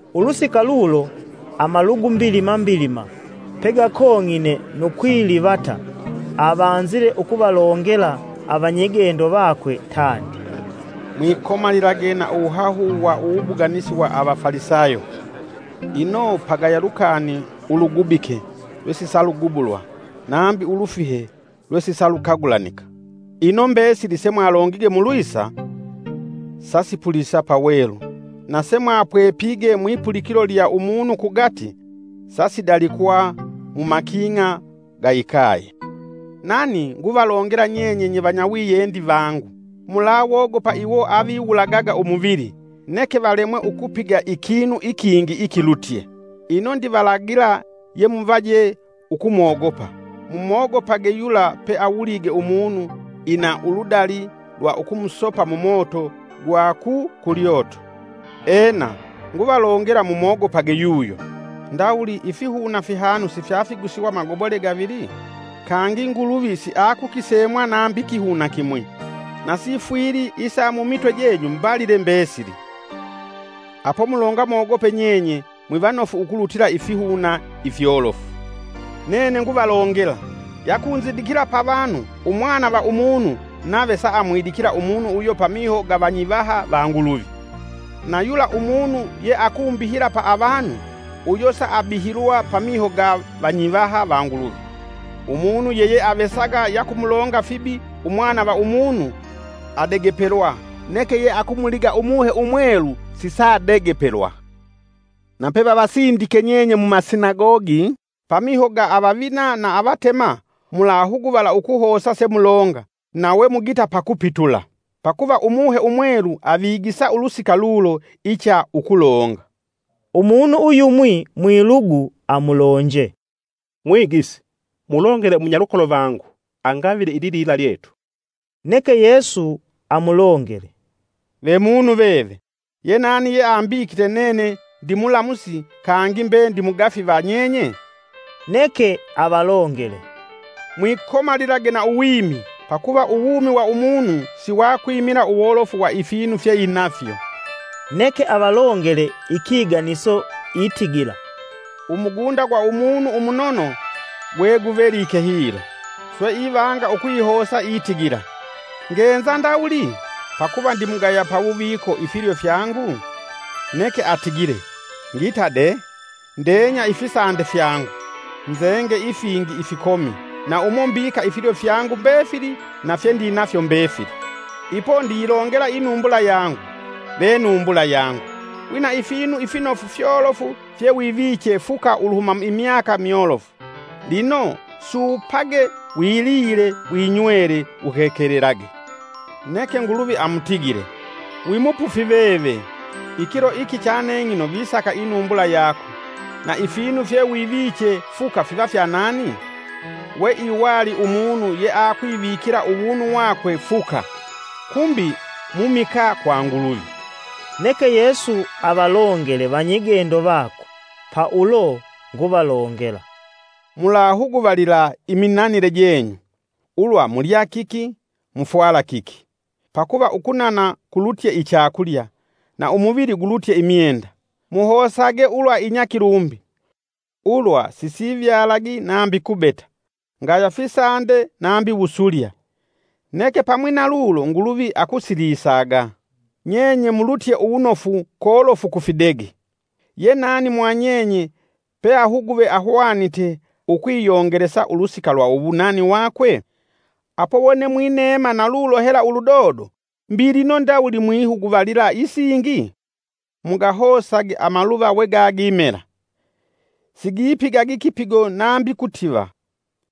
Ulusika lulo amalugu mbilima mbilima pegakong'ine nu kwilivata avanzile ukuvalongela avanyigendo vakwe tandi, “Mwikomalilage na uwuhahu wa uwubuganisi wa Avafalisayo. Ino pagaya lukani ulugubike lwesisalugubulwa nambi ulufihe lwesisalukagulanika. Ino mbesili semwalongige mulwisa sasipulisa pawelu na semwapwepige mwipulikilo lya umunu kugati sasidalikwa mumaking'a ga ikaye. “Nani nguvalongela nyenye nye vanyawiyendi vangu: mulawogopa iwo aviwulagaga umuvili, neke valemwe ukupiga ikinu ikingi ikilutye. Ino ndivalagila yemuvaje ukumwogopa: mumwogopage yula, peawulige umunu ina uludali lwa ukumusopa mumoto gwa ku kulyoto. Ena, nguvalongela mumwogopage yuyo. Ndawuli ifihuna fihanu sifyafigusiwa magobole gavili? Kangi Nguluvi siayikukisemwa nambi kihuna kimwi. Na sifwili isa mumitwe jenyu mbalile mbesili. Apo mulonga mogope nyenye mwivanofu ukulutila ifihuna ifyolofu! “Nene nguvalongela, yakunzindikila pa vanu, Umwana va Umunu nave saamwidikila umunu uyo pamiho ga vanyivaha va Nguluvi. Na yula umunu yeakumbihila pa avanu, uyo saabihilwa pamiho ga vanyivaha va Nguluvi. “Umunu yeyeavesaga yakumulonga fibi Umwana va Umunu adegepelwa; neke yeakumuliga Umuhe Umwelu sisadegepelwa. “Na pevavasindike nyenye mumasinagogi pamiho ga avavina na avatema, mulahuguvala ukuhosa semulonga na we mugita pakupitula. Pakuva Umuhe Umwelu avigisa ulusika lulo icha ukulonga.” Umunu uyumwi mwilugu amulonje, “Mwigisi, mulongele umunyalukolo vangu angavile ililila lyetu.” Neke Yesu amulongele, “Ve munu veve, yenani yeambikite nene ndimulamusi kangi mbe ndimugafi va nyenye?” Neke avalongele, “Mwikomalilage na uwimi, pakuva uwumi wa umunu siwakwimila uwolofu wa ifinu fyeinafyo.” Neke avalongele ikiganiso itigila: “Umugunda gwa umunu umunono gweguvelike hilo. Swe ivanga ukwihosa itigila: ‘Ngenza ndawuli? Pakuva ndimugaya pawuviko ifilyo fyangu? Neke atigile, ngita dee, ndenya ifisande fyangu, nzenge ifingi ifikomi na umo mbika ifilyo fyangu mbefili na fyendinafyo mbefili. Ipo ndiyilongela inumbula yangu, ve numbula yangu, wina ifinu finofu fyolofu fyewiviche fuka uluhuma imyaka myolofu, lino suupage wilile, winywele, uhekelelage.’ Neke Nguluvi amutigile, ‘Wi mupufi veve! Ikilo iki chaneng'ino visaka inumbula yako; na ifinu fyewiviche fuka fiva fya nani?’” “We iwali umunu yeakwivikila uwunu wakwe fuka, kumbi mumikaa kwa Nguluvi.” Neke Yesu avalongele vanyigendo vakwe, pa ulo nguvalongela, “Mulahuguvalila iminanile jenyu, ulwa mulya kiki; mufwala kiki. Pakuva ukunana kulutye ichakulya, na umuvili gulutye imyenda. Muhosage ulwa inyakilumbi, ulwa sisivyalagi nambi kubeta, ngaya fisande nambi wusulya, neke pamwi na lulo Nguluvi akusilisaga. Nyenye mulutye uwunofu kolofu ku fidege! Ye nani mwa nyenye peahuguve ahwanite ukwiyongelesa ulusika lwa uwunani wakwe? Apo wone mwineema na lulo hela uludodo, mbi lino ndawuli mwihuguvalila isingi? Mugahosage amaluva wegagimela. Sigipigagi kipigo nambi kutiva.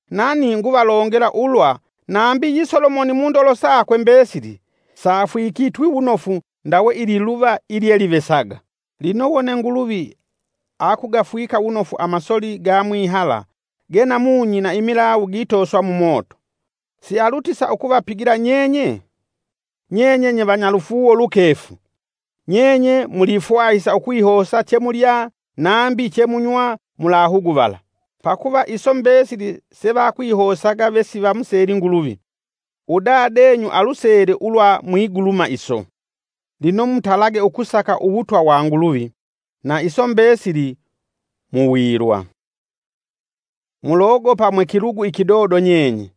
Nani nguvalongela ulwa nambi yi Solomoni mundolo sakwe mbesili safwikitwi wunofu ndawe ililuva ilyelivesaga. Lino wone Nguluvi akugafwika wunofu amasoli ga mwihala ganamunyi na imilawu gitoswa mumoto, sialutisa ukuvapigila nyenye? Nye nyevanyalufuuwo lukefu! Nyenye mulifwahisa ukwihosa chemulya, nambi chemunywa mulahuguvala. Pakuva iso mbesili se vakwihosaga vesivamuseli Nguluvi, udadenyu alusele ulwa mwiguluma iso. Lino mutalage ukusaka uwutwa wa Nguluvi; na iso mbesili muwilwa. “Mulogopa mwe kilugu ikidodo nyenye,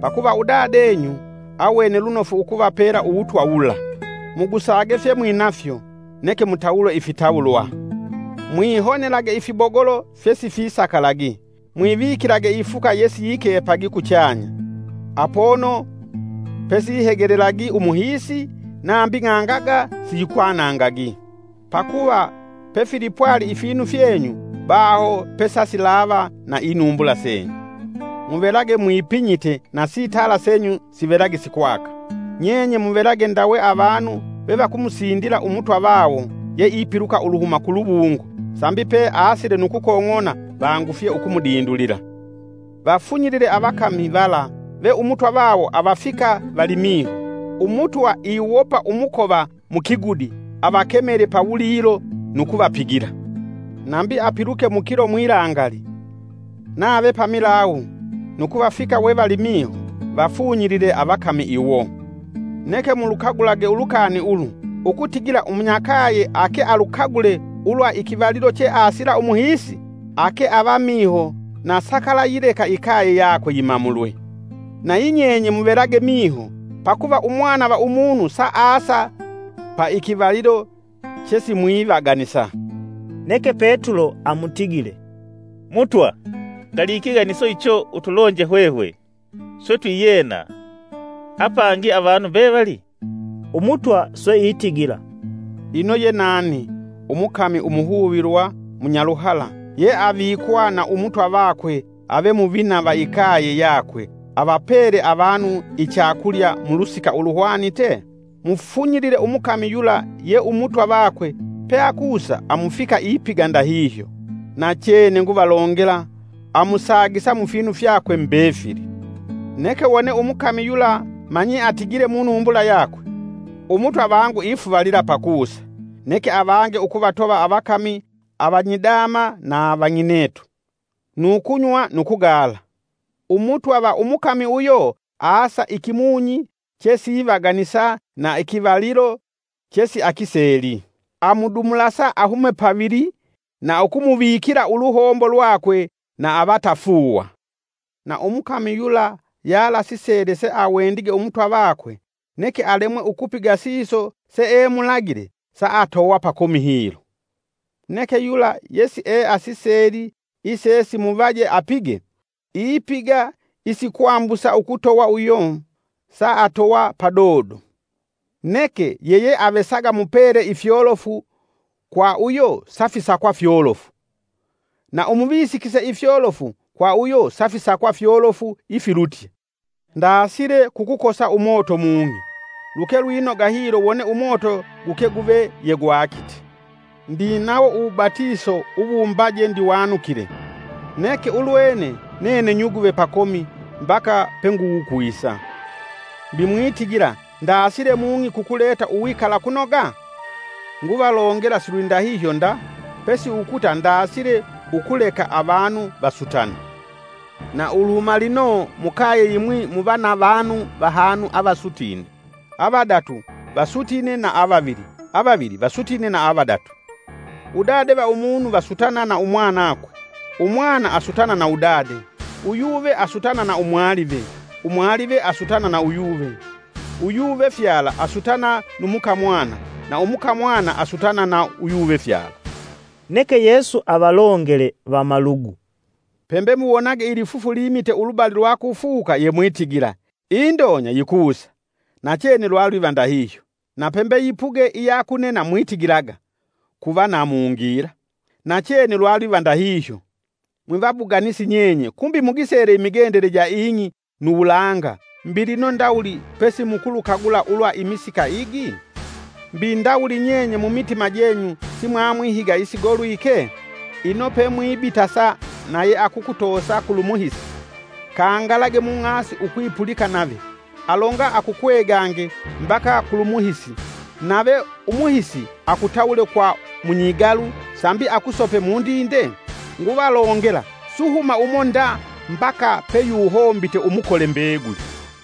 pakuva udadenyu awene lunofu ukuvapela uwutwa wula. Mugusage fyemwinafyo, neke mutawule ifitawulwa. Mwihonelage ifibogolo fyesifisakalagi, mwivikilage ifuka yesiyikepagi kuchanya, apono pesihegelelagi umuhiisi nambi ng'angaga siyikwanangagi. Pakuva pefilipwali ifinu fyenyu baho pesasilava na inumbula senyu. “Muvelage mwipinyite na sitala senyu sivelage sikwaka; nyenye muvelage ndawe avanu vevakumusindila Umutwa vawo yeipiluka uluhuma ku luwungo, sambi peasile nu kukong'ona vangufye ukumudindulila. Vafunyilile avakami vala ve Umutwa vawo avafika valimiho. Umutwa iwopa umukova mukigudi avakemele pawulilo nu kuvapigila. Nambi apiluke mukilo mwilangali, nave pamilawu nu kuvafika wevalimiho, vafunyilile avakami iwo. Neke mulukagulage ulukani ulu, ukutigila umunyakaye ake alukagule ulwa ikivalilo cheasila umuhiisi, ake ava miho na sakalayileka ikaye yakwe yimamulwe. Nayi nyenye muvelage miho, pakuva Umwana va Umunu saasa paikivalilo chesimwivaganisa.” Neke Petulo amutigile, “Mutwa, ngali ikiganiso icho utulonje hwehwe swe twiyena apangi avanu mbevali?” Umutwa swe itigila, “Ino ye nani, umukami umuhuvilwa munyaluhala ye avikwa na umutwa vakwe ave muvina va ikaye yakwe avapele avanu ichakulya mu lusika uluhwanite? Mufunyilile umukami yula ye Umutwa vakwe peakusa amufika ipiga ndahihyo. Nachene nguvalongela amusagisa mufinu fyakwe mbefili. Neke wone umukami yula manyi atigile munumbula yakwe; ‘Umutwa vangu ifuvalila pakusa’, Neke avange ukuvatova avakami avanyidama na vang'inetu, nu kunywa nu kugala, Umutwa va umukami uyo asa ikimunyi chesivaganisa na ikivalilo chesiakiseli. Amudumulasa ahume pavili na ukumuvikila uluhombo lwakwe na avatafuuwa. Na umukami yula yalasisele sawendige umutwa vakwe, neke alemwe ukupiga siso seemulagile saatowa pakomi hilo. Neke yula yesieasiseli, isesimuvaje apige, ipiga isikwambusa ukutowa uyo saatowa padodo. Neke yeyeavesaga mupele ifyolofu kwa uyo safisakwa fyolofu, na umuvisikise ifyolofu kwa uyo safisakwa fyolofu ifilutye. “Ndaasile kukukosa umoto, mung'i luke lwinoga hilo wone umoto guke guve yegwakite! Ndinawo uwubatiso uwumbaje ndiwanukile, neke ulwene nene nyuguve pakomi mbaka penguwukwisa! Mbi mwitigila ndaasile mung'i kukuleta uwikalakunoga? Nguvalongela silwidahihyo nda pesi ukuta ndaasile ukuleka avanu vasutane. Na uluhuma lino mukaye yimwi muva na vanu vahanu avasutine, avadatu vasutine na avavili, avavili vasutine na avadatu. Udade va umunu vasutana na umwanakwe, umwana asutana na udade, uyuve asutana na umwalive, umwalive asutana na uyuve, uyuvefyala asutana nu mukamwana, na umukamwana asutana na uyuvefyala.” Neke Yesu avalongele vamalugu, “Pembe muwonage lifufu limite ulubali lwa kufuka yemwitigila: ‘Indonya yikusa’, nachene lwalwiva ndahihyo. Na pembe yipuge iya kunena mwitigilaga, ‘Kuva na mungila’ nachene lwalwiva ndahihyo. Mwivabuganisi nyenye kumbi mugisele imigendele ja ing'i nu wulanga mbi lino ndawuli pesi mukulukagula ulwa imisika igi? “Mbi ndawuli nyenye mumitima jenyu simwamwihiga isigolwike? Ino pemwibitasa na yeakukutosa kulu muhisi, kangalage mung'asi ukwipulika nave, alonga akukwegange mbaka kulumuhisi nave umuhisi akutawule kwa munyigalu sambi akusope mundinde? Nguvalongela suhuma umo nda mbaka peyuhombite umukole mbeguli.”